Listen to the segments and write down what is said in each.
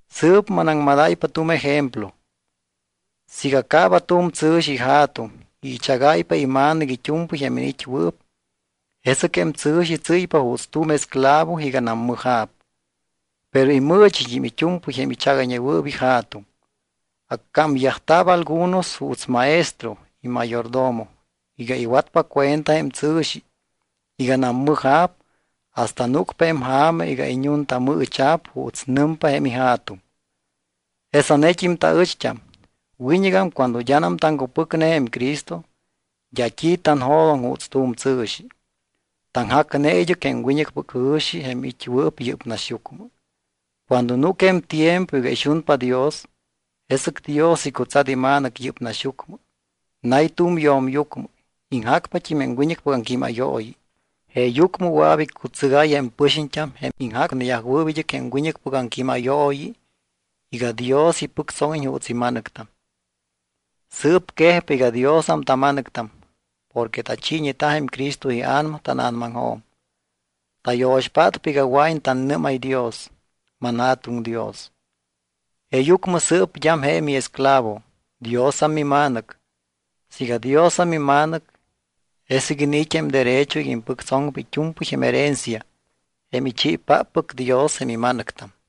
Sɨɨp manaŋmadáypa tu̱m ejemplo. Siiga caaba tu̱m tsɨ̱xi ija̱tuŋ y ichagáypa ima̱nɨc it́u̱mpɨy jém iniit́wɨɨp, jesɨc jém tsɨ̱xi tsɨ́ypa juuts tu̱m esclavo iganam mɨja̱p. Pero imɨɨchit́im it́u̱mpɨy jém ichagayñewɨɨp ija̱tuŋ. Accámyajta̱p algunos juuts maestro y mayordomo iga iwatpa cuenta jém tsɨ̱xi iganam mɨja̱p hasta núcpa jém ja̱ma iga iñuntamɨɨcha̱p juuts nɨmpa jém ija̱tuŋ. Jesanet́im taɨcht́am. Wiñɨgam cuando d́anam taŋcupɨcne jém Cristo, d́a t́i tanjo̱doŋ juuts tu̱m tsɨ̱xi. Taŋjacneta id́ɨc jém wiñɨcpɨc jɨ̱xi jém it́wɨɨp yɨ́p naxyucmɨ. Cuando núc jém tiempo iga ixunpa Dios, jesɨc Dios icutsat iMa̱nɨc yɨ́p naxyucmɨ. Nay tu̱m yo̱myucmɨ. Iŋjacpat́im jém wiñɨcpɨc aŋquímayooyi. Jeeyucmɨ wɨa̱p iccutsɨgáy jém pɨxiñt́am, jém iŋjacneyajwɨɨp id́ɨc jém wiñɨcpɨc aŋquímayooyi iga Dios ipɨctsóŋiñ juuts ima̱nɨctam. Sɨɨp quejpa iga Diosam tama̱nɨctam porque tachiiñeta jém Cristo iA̱nama tána̱namaŋjo̱m, tayo̱xpátpa iga wɨa̱iñ tannɨ́máy Dios: “ManJa̱tuŋ Dios.” Jeeyucmɨ sɨɨp d́am je miesclavo, Diosam mima̱nɨc. Siiga Diosam mima̱nɨc, jesɨc iniit́ jém derecho iga impɨctsoŋpa it́u̱mpɨy jém herencia, jém ichiipáppɨc Dios jém ima̱nɨctam.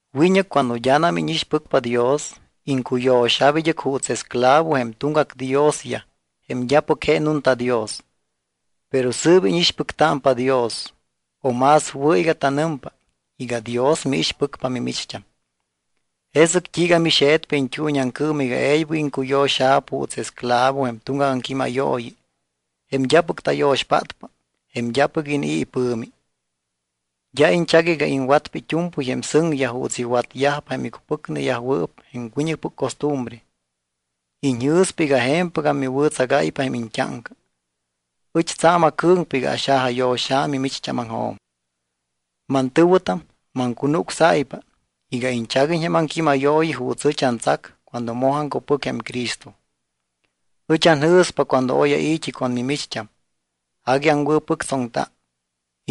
Wiñɨc cuando d́anam íñixpɨcpa Dios, iŋcuyo̱xa̱p id́ɨc juuts esclavo jém tuŋgac diosyaj jém d́apɨc je nunta Dios. Pero sɨɨp íñixpɨctámpa Dios o más wɨ̱ iga tanɨmpa iga Dios miixpɨcpa mimicht́am. ¿Jesɨc t́iiga mixe̱tpa iñt́uuñiaŋcɨɨm iga e̱ybɨc iŋcuyo̱xa̱p juuts esclavo jém tuŋgac aŋquímayooyi, jém d́apɨc tayo̱xpátpa, jém d́apɨc inii̱ ipɨ̱mi? D́a iñchac iga iŋwatpa it́u̱mpɨy jém sɨŋyaj juuts iwatyajpa jém icupɨcneyajwɨɨp jém wiñɨcpɨc costumbre. Iñjɨ̱spa iga je̱mpɨgam miwɨ̱tsagáypa jém iñt́áŋca. Ɨch tsa̱m acɨ̱ŋpa iga axajayo̱xa̱ mimicht́ámaŋjo̱m. Mantɨ̱wɨtam, maŋcunucsáypa iga iñchaguiñ jém aŋquímayooyi juuts ɨch antsac cuando moj aŋcupɨc jém Cristo. Ɨch anjɨ̱spa cuando oy ai̱t́i con mimicht́am, agui aŋwɨ̱pɨctsoŋta.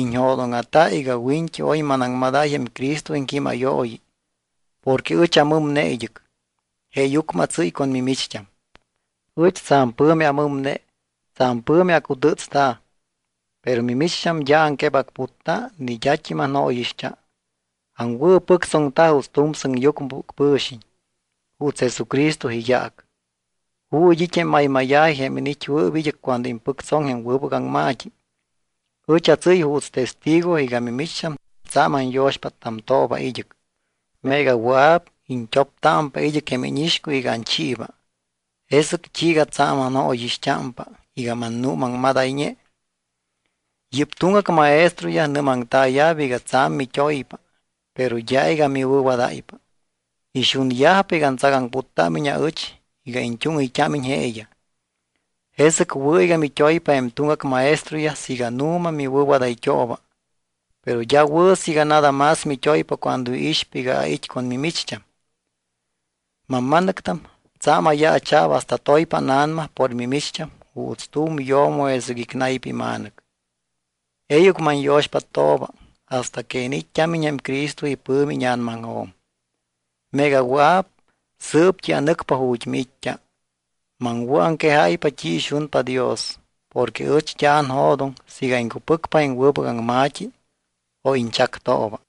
Iñjo̱dóŋa̱ta iga wiñt́i oy manaŋmadáy jém Cristo iŋquímayooyi porque ɨch amɨmne id́ɨc, jeeyucmɨ atsɨ́y con mimicht́am. Ɨch tsa̱m pɨ̱mi amɨmne, tsa̱m pɨ̱mi acutɨ́tsta̱, pero mimicht́am d́a aŋquebacputta, ni d́at́im anjóyixt́a. Aŋwɨ̱pɨctsoŋta juuts tu̱m sɨŋyucmɨpɨc pɨ̱xiñ, juuts Jesucristo iyaac. ¿Ju̱t́ it́ jém maymáya̱ji jém iniit́wɨɨp id́ɨc cuando impɨctsoŋ jém wɨbɨc aŋma̱t́i? Ɨch atsɨ́y juuts testigo iga mimicht́am tsa̱m anyo̱xpáttamtooba id́ɨc. Meega wɨa̱p, iñt́optámpa id́ɨc jém íñixcuy iga anchiiba. ¿Jesɨc t́iiga tsa̱m anjóyixt́ámpa iga mannuumaŋmadayñe? Yɨ́p tuŋgac maestroyaj nɨ́maŋtaaya̱p iga tsa̱m mit́oypa, pero d́a iga miwɨ̱wadáypa. Ixunyajpa iga antsagaŋputtámiñ aɨch iga iñt́úŋɨyt́ámiñ jeeyaj. Jesɨc wɨ̱ iga mit́oypa jém tuŋgac maestroyaj siiga nu̱ma miwɨ̱wadayt́ooba, pero d́a wɨ̱ siiga nada más mit́oypa cuando iixpa iga ait́ con mimicht́am. Mamma̱nɨctam, tsa̱m ayaacha̱p hasta toypa ána̱nama por mimicht́am juuts tu̱m yo̱mo jesɨc icnaypa ima̱nɨc. E̱ybɨc manyo̱xpáttooba hasta que iniit́t́ámiñ jém Cristo ipɨ̱mi íña̱namaŋjo̱m. Meega awɨa̱p, sɨɨpt́i anɨcpa ju̱t́ miit́t́a. Maŋwɨ̱aŋquejáypa t́i ixunpa Dios. Porque ɨch d́a anjo̱doŋ siiga iŋcupɨcpa jém wɨbɨc aŋma̱t́i o iñchactooba.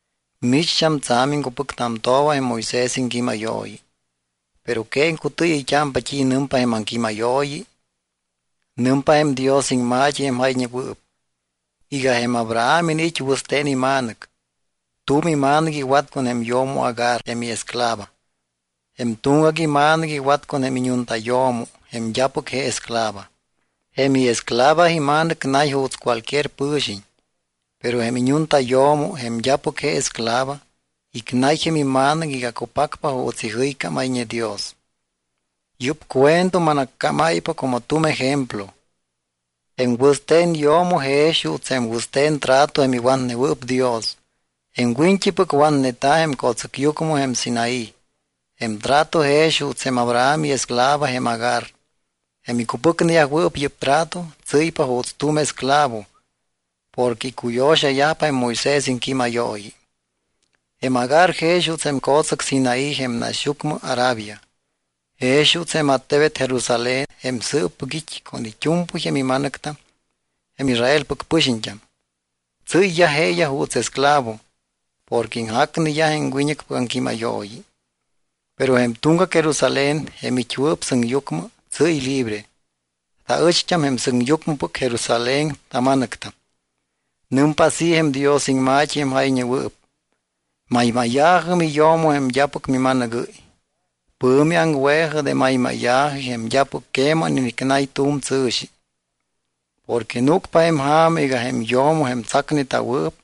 Micht́am tsa̱m iŋcupɨctamtooba jém Moisés iŋquímayooyi. ¿Pero que iŋcutɨɨyɨyt́ámpa t́i nɨmpa jém aŋquímayooyi? Nɨmpa jém Dios iŋma̱t́i, jém jayñewɨɨp, iga jém Abraham iniit́ wɨste̱n ima̱nɨc. Tu̱m ima̱nɨc iwat con jém yo̱mo Agar, jém iesclava. Jém tuŋgac ima̱nɨc iwat con jém iñuntayo̱mo jém d́apɨc je esclava. Jém iesclava ima̱nɨc nay juuts cualquier pɨ̱xiñ. Pero jém iñuntayo̱mo, jém d́apɨc je esclava, icnay jém ima̱nɨc iga cupacpa juuts ijɨycámayñe Dios. Yɨ́p cuento manaccámáypa como tu̱m ejemplo. Jém wɨste̱n yo̱mo jex juuts jém wɨste̱n trato jém iwatnewɨɨp Dios. Jém wiñt́ipɨc watneta̱ jém co̱tsɨcyucmɨ jém Sinaí. Jém trato jex juuts jém Abraham iesclava jém Agar. Jém icupɨcneyajwɨɨp yɨ́p trato tsɨ́ypa juuts tu̱m esclavo porque icuyo̱xayajpa jém Moisés iŋquímayooyi. Jém Agar jex juuts jém co̱tsɨc Sinaí jém naxyucmɨ Arabia, jex juuts jém attebet Jerusalén jém sɨɨppɨc it́ con it́u̱mpɨy jém ima̱nɨctam jém Israelpɨc pɨxiñt́am. Tsɨ́yyaj jeeyaj juuts esclavo porque iŋjacneyaj jém wiñɨcpɨc aŋquímayooyi. Pero jém tuŋgac Jerusalén, jém it́wɨɨp sɨŋyucmɨ, tsɨ́y libre. Taɨcht́am jém sɨŋyucmɨpɨc Jerusalén tama̱nɨctam. Nɨmpa así jém Dios iŋma̱t́i jém jayñewɨɨp: Maymáya̱jɨ, miyo̱mo, jém d́apɨc mima̱nɨgɨ́y. Pɨ̱mi aŋwe̱jɨ de maymáya̱ji jém d́apɨc queman inicnay tu̱m tsɨ̱xi. Porque núcpa jém ja̱ma iga jém yo̱mo jém tsacneta̱wɨɨp,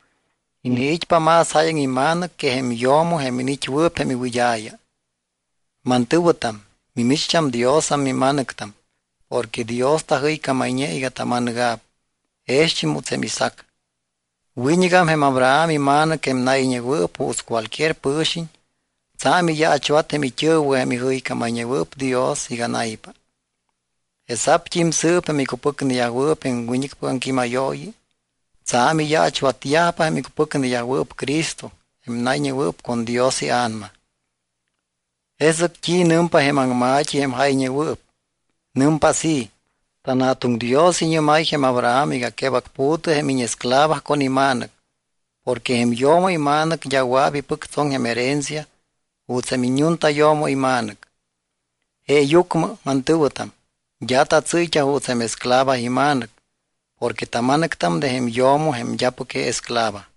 iniit́pa más jáyaŋ ima̱nɨc que jém yo̱mo jém iniit́wɨɨp jém iwɨd́a̱ya. Mantɨ̱wɨtam, mimicht́am Diosam mima̱nɨctam porque Dios tajɨycámayñe iga tama̱nɨga̱p jext́im juuts jém Isaac. Wiñɨgam jém Abraham ima̱nɨc, jém nayñewɨɨp juuts cualquier pɨ̱xiñ, tsa̱m iyaachwat jém it́ɨ̱wɨ jém ijɨycámayñewɨɨp Dios iga naypa. Jesa̱pt́im sɨɨp jém icupɨcneyajwɨɨp jém wiñɨcpɨc aŋquímayooyi tsa̱m iyaachwatyajpa jém icupɨcneyajwɨɨp Cristo jém nayñewɨɨp con Dios iA̱nama. ¿Jesɨc t́i nɨmpa jém aŋma̱t́i jém jayñewɨɨp? Nɨmpa así: “TanJa̱tuŋ Dios iñɨ́máy jém Abraham iga quebacpu̱tɨ jém íñesclava con ima̱nɨc porque jém yo̱mo ima̱nɨc d́a wɨa̱p ipɨctsoŋ jém herencia juuts jém iññuntayo̱mo ima̱nɨc.” Jeeyucmɨ, mantɨ̱wɨtam, d́a tatsɨ́yt́a juuts jém esclava ima̱nɨc porque tama̱nɨctam de jém yo̱mo jém d́apɨc je esclava.